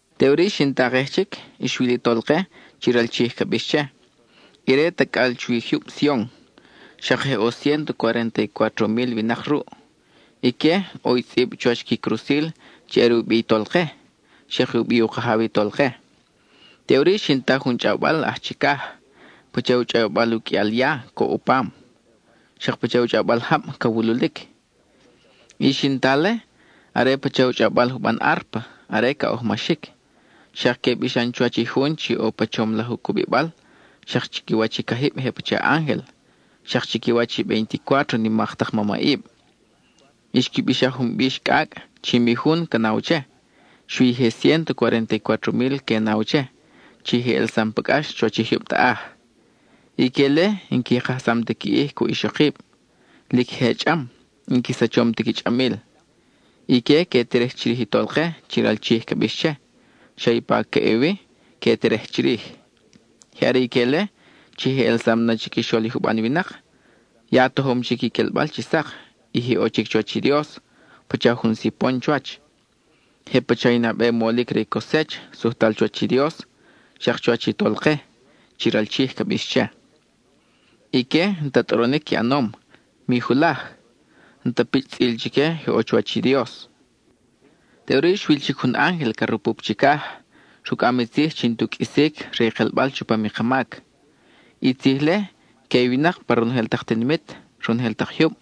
Teʼuri xin takej chic, xwil i Tolke, chi ral Chij ca bix che, ire tacʼal chuwi i jyub Sion. Xak je ʼo ciénto cuarénta y cuátro mil winak ruʼ. Ique, ʼo i tzʼib chuwach qui crusil chi are u bi i Tolke, xak i u bi u Kajaw i Tolke. Teʼuri xin ta jun chʼawbal aj chicaj, pacha u chʼawbal u qʼuial ya, coʼ u pam, xak pacha u chʼawbal jab ca wululic. I xin ta-le, are pacha u chʼawbal juban árpa, are ca ʼojmaxic. Xak que bixan chuwach i jun chi ʼo pa chom laj u cubibal, xak chiquiwach i cajib je pacha ángel, xak chiquiwach i veinticuátro nimak tak mamʼib. Xqui bixaj jun bix cʼacʼ chi mi jun ca naw che, xui i je ciénto cuarénta y cuátro mil que naw che, chi je ʼelsam pa cʼax chuwach i jyub taʼaj. Ique-le n-qui kajsam ti qui ʼij cuʼ ixokib; lic je chʼam, n-qui sachom ti qui chʼamil. Ique que terej chirij i Tolke, chi ral Chij ca bix che; xa ipa ca ʼe wi que terej chirij. Je are ique-le chi je ʼelsam na chiquixol i juban winak, ya tojom chic i quelbal chi sak, y je ʼo chic chuwach i Dios, pacha jun sipon chuwach. Je pacha i nabe molic re i cosech, sujtal chuwach i Dios, xak chuwach i Tolke, chi ral Chij ca bix che. Ique, n-ta tʼoronic qui ʼanom, mi julaj. N-ta pichʼ tzʼil chique, je ʼo chuwach i Dios. Teʼuri x wil chic jun ángel ca rupup chicaj, rucʼam i tzij chi n-tu qʼuisic re i kelbal chupam i ka mac. I tzij-le, que i winak pa ronojel tak tinimit, ronojel tak jyub,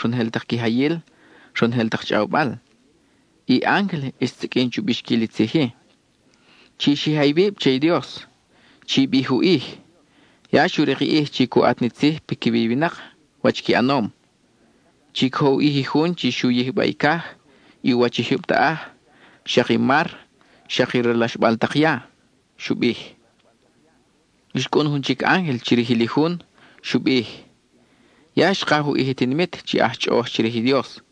ronojel tak quijayil, ronojel tak chʼawbal. I ángel xsiqʼuin chu bixquil i tzij-i: —¡Chi xija iwib che i Dios! ¡Chi bij u ʼij! Ya xu rik i ʼij chi cu ʼat ni tzij piquiwi i winak, wach qui ʼanom. Chi cojo u ʼij i jun chi xu yijba i caj, i u wach i jyub taʼaj, xak i mar, xak i ralaxbal tak ya —xu bij. Xcʼun jun chic ángel chirijil i jun; xu bij: —¡Ya xkaj u ʼij i tinimit chi aj chʼoʼoj chirij i Dios,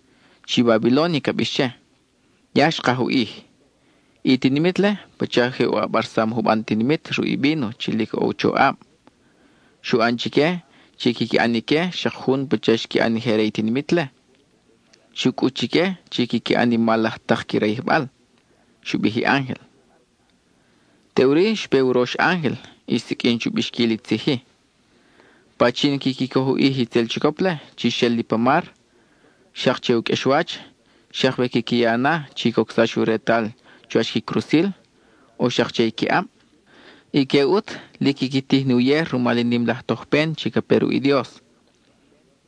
chi Babilónia ca bix che! ¡Ya xkaj u ʼij! I tinimit-le pacha je u ʼabarsam i juban tinimit ruʼ i víno chi lic ʼo u choʼab. Xu ʼan chique chi quiqui ʼan ique xak jun pacha xqui ʼan i je re i tinimit-le. Xu cʼut chique chi quiqui ʼan i mal laj tak qui rayijbal —xu bij i ángel. Teʼuri xpe i urox ángel y xsiqʼuin chu bixquil i tzij-i: —Pachin quiqui coj u ʼij i itzel chicop-le chi xel li pa mar, xak che u qʼuexwach, xak we quiqui ya na chi cocsax u retal chuwach qui crusil, o xak che qui ʼab, ique ʼut lic quiqui tij ni uyej rumal i nim laj tojpen chi ca pe ruʼ i Dios.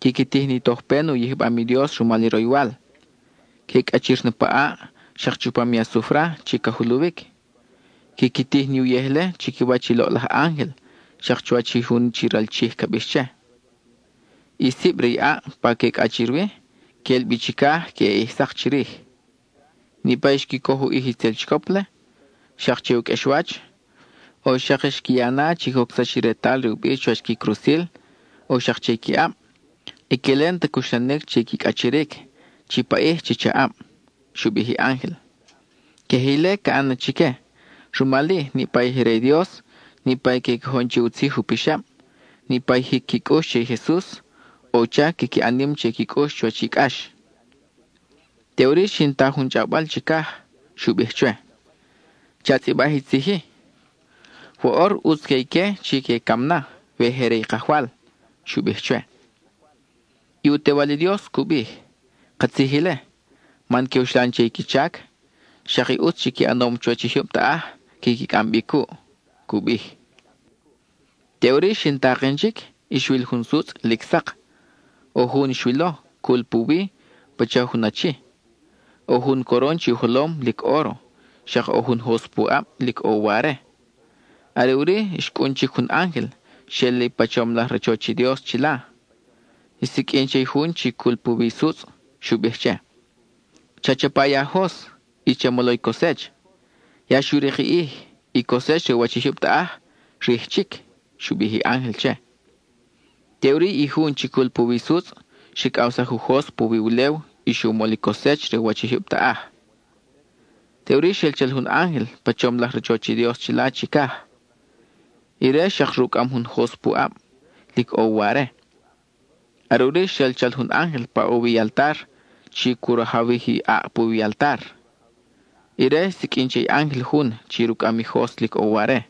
Quiqui tij ni tojpen u yijbam i Dios rumal i roywal. Que cʼachir na pa ʼaʼ, xak chupam i asufra chi ca juluwic. Quiqui tij ni uyej-le chiquiwach i loʼlaj ángel xak chuwach i jun chi ral Chij ca bix che. I sib re i ʼaʼ pa que cʼachir wi, quel bi chicaj queʼe ʼij sak chirij. Niʼpa i xqui coj u ʼij i itzel chicop-le, xak che u qʼuexwach, o xak xqui ya na chi cocsax i retal re u bi chuwach qui crusil, o xak che qui ʼab, ique-le n-ta cuxla-nic che qui cʼachiric, chi paʼij chi chaʼab —xu bij i ángel. Queje ile ca ʼan na chique; rumal-i, niʼpa i je re i Dios, niʼpa i que cojon che u tzij u pixab, niʼpa i jic qui cʼux che i Jesus, ʼo u chac quiqui ʼan nim che qui cʼux chuwach i cʼax. Teʼuri xin ta jun chʼawbal chicaj; xu bij chwe: —Cha tzʼibaj i tzij-i: “Woʼor, ʼutz que ique chi que cam na, we je re i Kajwal.” —xu bij chwe. I u Tewal i Dios cu bij: —Katzij ile, man que uxlan che i qui chac; xak i ʼutz chi qui ʼanom chuwach i jyub taʼaj quiqui cʼam bi cuʼ —cu bij. Teʼuri xin taken chic, y xwil jun sutzʼ lic sak; ʼo jun xwilo, cul puwi, pacha jun achi. ʼO jun coron che u jolom, lic óro, xak ʼo jun jos pu ʼab, lic ʼo u ware. Are ʼuri, xcʼun chic jun ángel, xel li pa chom laj rachoch i Dios chila. Xsiqʼuin che i jun chi cul puwi i sutzʼ; xu bij che: —Cha chapa i a jos, y cha molo i cosech. Ya xu rik i ʼij; i cosech re u wach i jyub taʼaj, rij chic —xu bij i ángel che. Teʼuri i jun chi cul puwi i sutzʼ xricʼawsaj u jos puwi ulew y xu mol i cosech re u wach i jyub taʼaj. Teʼuri xel chal jun ángel pa chom laj rachoch i Dios chila chicaj; ire xak rucʼam jun jos pu ʼab, lic ʼo u ware. Are ʼuri xel chal jun ángel pa ʼo wi i altar, chi cu rajawij i ʼaʼ puwi i altar. Ire xsiqʼuin che i ángel jun chi rucʼam i jos lic ʼo u ware: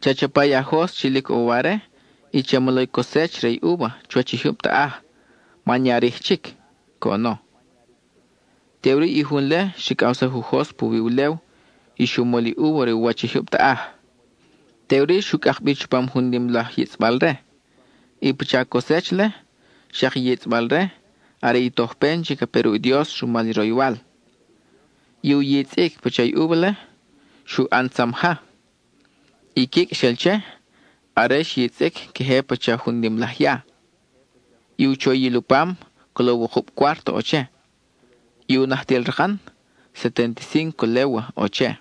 —Cha chapa i a jos chi lic ʼo u ware y cha molo i cosech re i úva chuwach i jyub taʼaj man ya rij chic —coʼono. Teʼuri i jun-le xricʼawsaj u jos puwi ulew, y xu mol i úva re u wach i jyub taʼaj. Teʼuri xu cʼak bi chupam jun nim laj yitzʼbal-re. I pacha cosech-le, xak i yitzʼbal-re, are i tojpen chi ca pe ruʼ i Dios rumal i roywal. I u yitzʼic i pacha úva-le, xu ʼan tzam ja. I quicʼ xel che, are xyitzʼic, queje pacha jun nim laj ya. I u choyil u pam, colo wukub cuárto ʼo che; i u najtil rakan, setenticínco légua ʼo che.